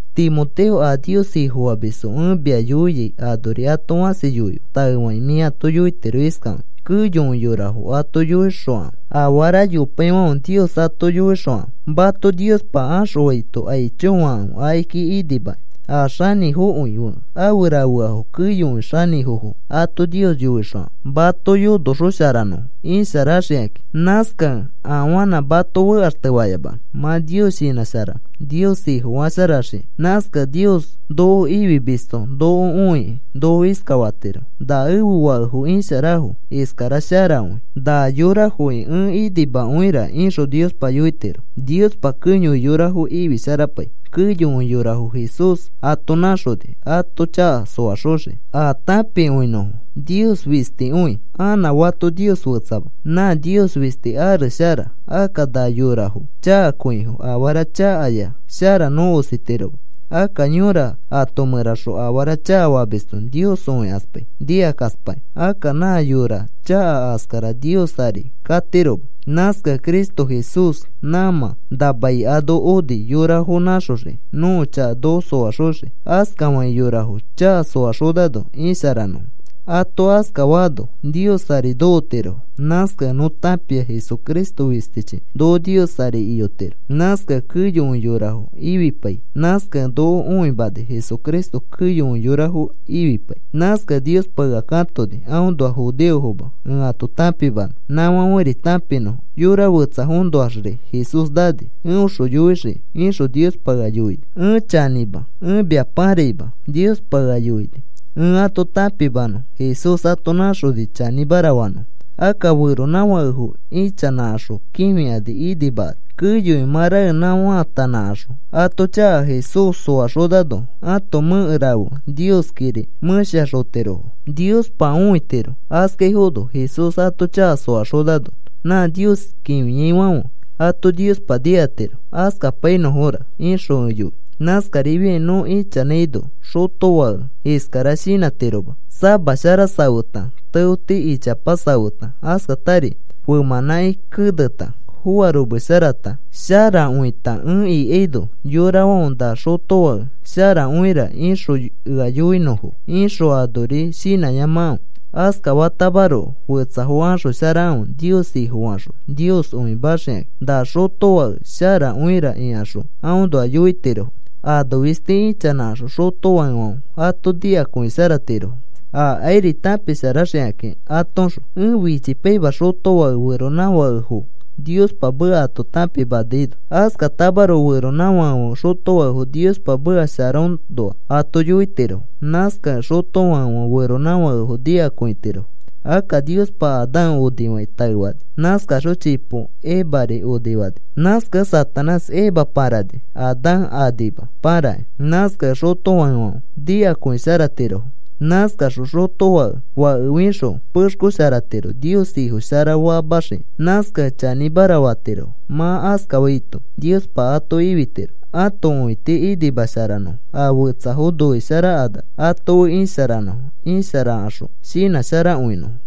Timoteo, a Nios Ifofamisfo ẽ mia yoiai anori ato fãsi yoife. Taefakĩ mĩ ato yoitiro iskafakĩ: “Keyokõi yorafo ato yoixokãfe. Afara yopaifãfe Nios ato yoixokãfe. Mato Niospa axõfaito aicho fakãfe akiki inimakĩ. A xanĩfokõi fe afe rafeafo keyokõi xanĩfofo ato Nios yoixokãfe mato yonoxosharanõfo isharaxikãkĩ. Nãskakẽ afanã mato fekaxtefayamanõ, mã Nios shinãsharanõ, Nios Ifofasharaxiki.” Nãskakẽ Nios noko ifimisto noko õikĩ noko iskafatiro: “Na ẽfe fakefo isharafo. Iskara sharakõi. Na yorafoki ẽ inimakõira,” ixõ Niospa yoitiro. Niospa keyokõi yorafo ifisharapai, keyokõi yorafo Jesús ato nãxoni ato chaka soaxoxikĩ a tãpikõinõfo. Nios fistikõi, anã fato Nios fetsama. Nã Nios fisti ares shara. Akka na yorafo chakakõifo. Afara chakaya shara nõ ositiroma. Akka yõra ato mẽraxõ afara chakafamisto Nios õikaspai, nikakaspakĩ. Akka nã yora chaka askara Nios ari katiroma. Nãskakẽ Cristo Jesús nãmã na mai ano oni yorafo nãxoxiki nõko chaka noko soaxoxiki. Askafakĩ, yorafo chaka soaxonano isharanõfo, ato askafaano, Nios ari nokotirofo. Nãskakẽ nõ tãpia Jesucristo fistichi noko Nios ari iyotiro. Nãskakẽ keyokõi yorafo ifipai. Nãskakẽ noko õimani Jesucristo keyokõi yorafo ifipai. Nãskakẽ Niospa ea katoni aõnoa judeofoma ẽ ato tãpimanõ nãfãferi tãpinõfo. Yora fetsafoõnoaxri Jesús nani. “Eõxõ yoixiki,” ixõ Niospa ea yoini. Ẽ chanĩma, ẽ mia paraima. Niospa ea yoini ẽ ato tãpimanõ Jesús ato nãxoni chanĩmara fanõfo. Akka feronãfakefo ichanãkaxõ kĩfikani inimakani, keyokõi mã raenã faatanãkaxõ ato chaka Jesús soaxonano, ãto mẽke rafe Nioskiri mẽshaxotirofo Niospa õitiro. Askaifono Jesús ato chaka soaxonano, nã Nios kĩfiaifãfe ato Niospa nikatiro. Askapainõfora ixõ ẽ yoi. Nãskarifiakĩ nõ ichanãino xotofãke iskara shinãtiroma: “Sama shara safeta, teoti ichapa safeta, askata femãnãki keneta, foaromesharata, irosharakõita, ẽ ikaino yorafãfe, ‘Na xotofake sharakõira’ ixõ ea yoinõfo,” ixõ anori shinãyamakãfe. Askafatamaroko, fetsafo axosharakãfe, Nios Ifofaxõ Nios õimaxikakĩ. “Na xotofake sharakõira,” ikaxõ aõnoa yoitirofo. Ano fisti ichanãkaxõ xotofakefãfe ato nikakõisharatirofo. Akairi tãpisharaxikakĩ atoõxõ. Ẽ fichipaima xotofãke feronãfakefo Niospa meka ato tãpimanaino. Askatamaroko feronãfakefãfe xotofakefo Niospa meka sharaõnoa ato yoitirofo. Nãskakẽ xotofakefãfe feronãfakefo nikakõitirofo. Akka Niospa Adán onifakĩ taefani. Nãskaxõ chipo Evari onifani. Nãskakẽ Satanás Eva pãrani. Adán anima pãrakĩ. Nãskakẽ xotofakefãfe nikakõisharatirofo. Nãskaxõ xotofãke fake fixõ pexkosharatiro, Nios Ifo shara famaxiki. Nãskakẽ chanĩmara fatirofo. Mã askafaito Niospa ato ifitiro. Ãto õiti inimasharanõfo a fetsafo noisharakanax ato fe isharanõfo. Isharakaxõ, shinãsharakõinõfo.